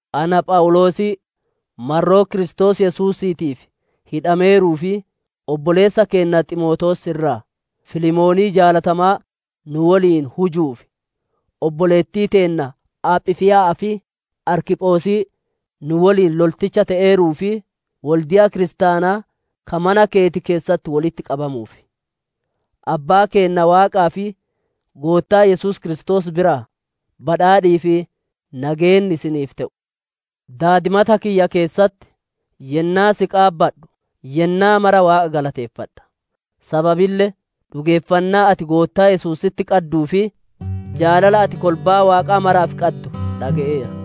Ana Phawuloosii marroo Kiristoos Yesuusiitiif hidhameeruu fi obboleessa keenna Ximootewoos irraa, Filemoonii jaalatamaa nu woliin hujuuf, obboleettii teenna Aaphifiiya'aaf, Arkiphosii nu woliin lolticha te'eeruu fi wolde'a kiristaanaa ka mana keeti keessatti wolitti qabamuuf: Abbaa keenna Waaqaa fi Goottaa Yesuus Kiristoos biraa badhaadhii fi nageenni isiniif te'u! Daadimata kiyya keessatti yennaa si qaabadhu, yennaa mara Waaqa galateeffadha. Sababille dhugeeffannaa ati Goottaa Yesuusitti qadduu fi jaalala ati kolbaa Waaqaa maraaf qaddu dhage'eera.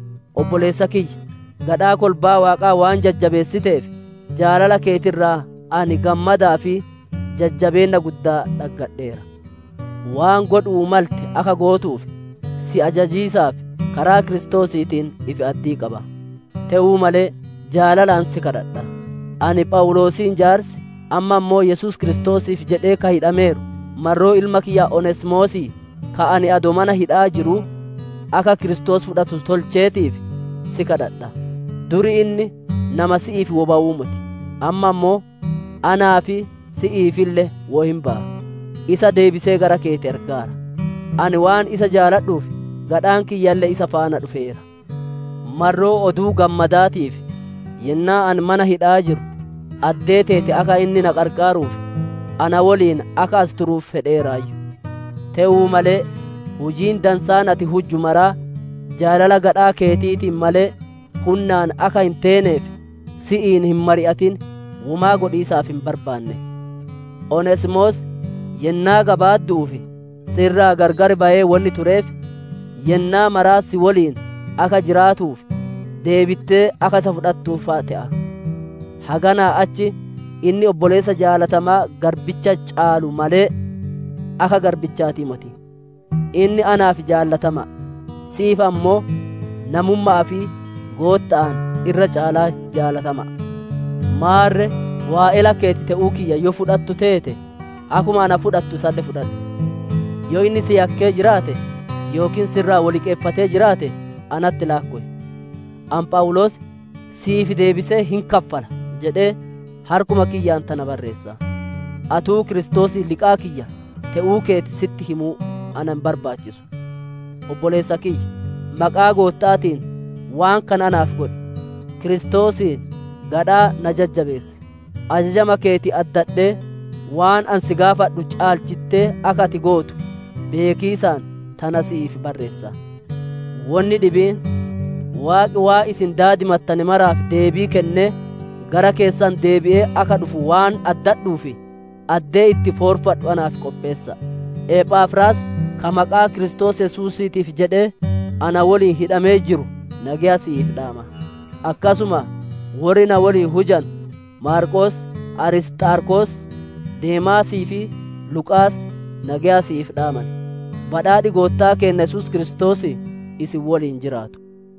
Obboleessa kiyya, gadhaa kolbaa Waaqaa waan jajjabeessiteef jaalala keeti irraa ani gammadaa fi jajjabeenna guddaa dhaggadheera. Waan godhu'uu malte akka gootuuf, si ajajiisaaf karaa Kiristoosiitiin ifi-addii qaba; te'uu malee jaalalaan si gaafadha. Ani Phawuloosiin jaarsi, amma ammoo Yesuus Kiristoosiif jedhee ka hidhameeru, marroo ilma kiyya Oneesimoosii, ka ani adoo mana hidha'aa jiruu akka Kiristoos fudhatu tolcheetiif si gaafadha. Dur inni nama si'iif woy bawuu moti, amma ammoo anaa fi si'iifille woy hin baya. Isa deebisee gara keeti ergeera; ani waan isaa jaaladhuuf gadhaan kiyyalle isa faana dhufeera. Marroo Oduu Gammadaatiif, yennaa ani mana hidha'aa jiru, addee teeti akka inni na qarqaaruuf, na woliin as akka turuuf fedheeraayyu. Te'uu malee hujiin dansaan ati hujju maraa jaalala gadhaa keetiitiin malee, hunnaan akka hin teeneef, si'iin hin mari'atin womaa godhiisaaf hin barbaanne. Oneesimoos yennaa gabaaddu'uuf si irraa gargar bayee wonni tureef, yennaa mara si woliin akka jiraatuuf deebittee akka isa fudhattuuf fa'a te'a. Haganaa achi, inni obboleessa jaalatamaa garbicha caaluu malee, akka garbichaati moti. Inni naaf jaalatama'a, si'iif ammoo namumma'aa fi Gootta'aan, irra caalaa jaalatama'a. Maarre waa'ela keeti te'uu kiyya yoo fudhattu teete, akkuma na fudhattu isalle fudhadhu. Yoo inni si yakkee jiraate, yookiin si irraa wo liqeeffatee jiraate natti laakkow! Ani Phawuloos, «Si'iif deebisee hin kaffala» jedhee harkuma kiyyaan tana barreessa; atuu Kiristoosiin liqaa kiyya te'uu keeti sitti himuu na hin barbaachisu. Obboleessa kiyya, maqaa Gootta'aatiin waan kana naaf godhi! Kiristoosiin gadhaa na jajjabeessi. Ajajama keeti addadhee, waan ani si gaafadhu caalchitte akka ati gootu beekiisaan tana si'iif barreessa. Wonni dhibiin: Waaqi waan isin daadimattane maraaf deebii kennee, gara keessan deebi'ee akka dhufu waan addadhuuf, addee itti foorfadhu naaf qopheessa'a. Ephafraas, ka maqaa Kiristoos Yesuusiitiif jedhee na woliin hidhamee jiru nageya si'iif dhaama. Akkasuma worri na woliin hujanu Maarqoos, Arisxaarkos, Deemaasii fi Luqaas nageya si'iif dhaaman. Badhaadhi Goottaa keenna Yesuus Kiristoosii isin woliin jiraatu.